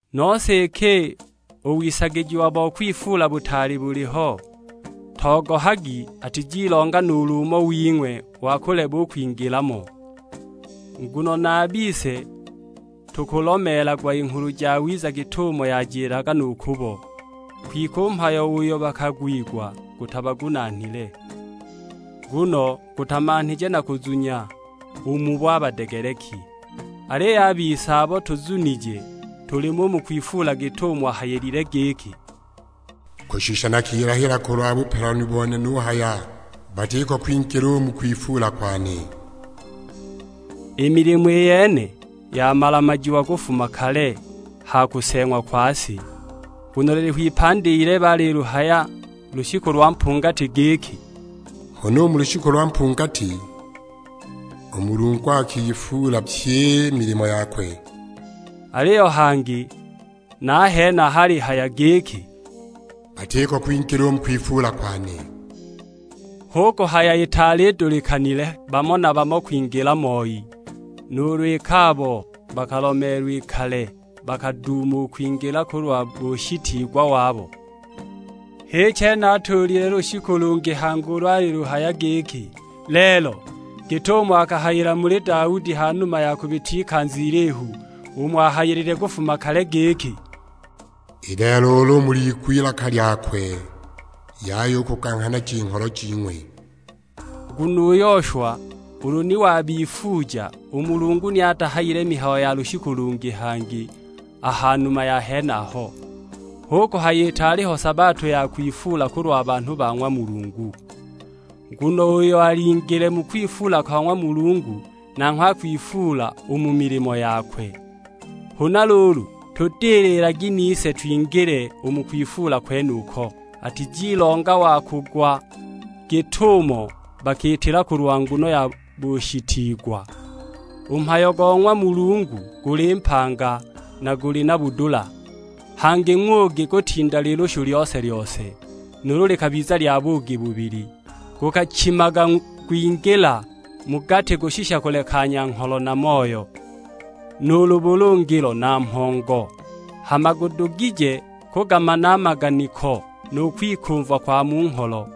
Nose iki u wisagijiwa bo kwifuula butaali buliho, togohagi atizilonga nuulu umo wing'we wa kuleba u kwingila mo. Nguno na a bise tukulomeelagwa i Nghulu Jawiza git'umo yajilaga nu kubo; kwike u mhayo uyo bakagwigwa gutabagunaanile, nguno gutamanhije na kuzunya u mubo a badegeleki. Aliyo a bise abo tuzunije tulimo u mu kwifuula, git'umo ahayilile; giki, "Kushisha nakilahila kulwa bupelanu bone nuhaya, 'Batiko kwingila u mu kwifuula kwane.' " I milimo i yene yamala-majiwa kufuma kale ha kuseeng'wa kwa si. Nguno liliho ipandi ilebe aliluhaya lushiku lwa mpungati giki, "Huna u mu lushiku lwa mpungati u Mulungu akifuula pyi i milimo yakwe." Aliyo hangi na a henaha alihaya giki, "Batiko kwingila u mu kwifuula kwane!" Hu kuhaya itaali idulikanile bamo na bamo kwingila moi, nuulu iki abo bakalomeelwa i kale bakaduuma u kwingila kulwa bushitiigwa wabo. H'i chene atuulile lushiku lungi hangi ulo aliluhaya giki, "Lelo," git'umo akahayila muli Daudi ha numa ya kubita ikanza ilihu. Umo ahayilile kufuma kale giki, "I lelo ulu muliigwe ilaka lyakwe, yaya u kuganghanaja i ngholo jing'we." Nguno u Yoshwa ulu ni wabifuuja, u Mulungu ni atahayile mihayo ya lushiku lungi hangi a ha numa ya henaho. Hu kuhaya itaali ho sabato ya kwifuula kulwa banhu ba ng'wa Mulungu. Nguno uyo alingile mu kwifuula kwa ng'wa Mulungu nanghwe akwifuula u mu milimo yakwe. Huna luulu tudililagi, nise twingile u mu kwifuula kwenuko; atizilonga wa kugwa git'umo bakiitila kulwa nguno ya bushitiigwa. U mhayo go ng'wa Mulungu guli mpanga, na guli na budula; hangi ng'ugi kutinda lilushu lyose-lyose, nuulu likabiza lya buugi bubili. Gukachimaga gwingila mu gati kushisha kulekanya ngholo na moyo, nuulu bulungilo na mhongo; hama gudugije kugamana a maganiko nu kwikumva kwa mu ngholo.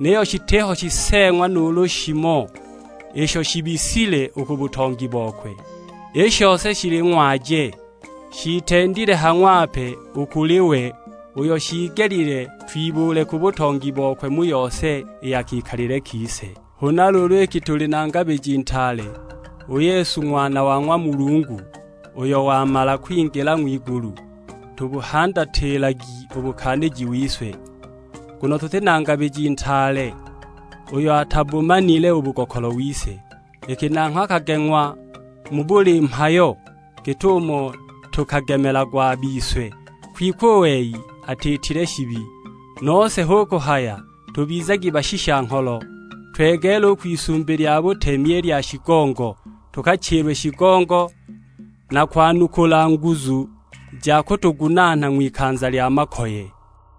Niyo shitiho shiseeng'wa nuulu shimo isho shiibisile u ku butongi bokwe, i shose shili ng'waje; shiitendile ha ng'wape u kuli we, uyo shiigelile twibuule ku butongi bokwe mu yose i ya kikalile kise! Huna luulu iki tuli na Ngabiji Ntaale, u Yesu Ng'wana wa ng'wa Mulungu, uyo wamala kwingila ng'wigulu, tubuhandatilagi u bukaaniji wise. Nguno tuti na Ngabiji Ntaale uyo atabumanile u bugokolo wise, iki nanghwe akageng'wa mu buli mhayo git'umo tukagemelagwa a bise, kwike u wei atiitile shibi. Nose hu kuhaya tubizagi bashisha-ngholo, twegeele u kwisumbi lya butemi i lya shigongo, tukachilwe shigongo; na kwanukula nguzu ja kutugunaana ng'wikanza lya makoye.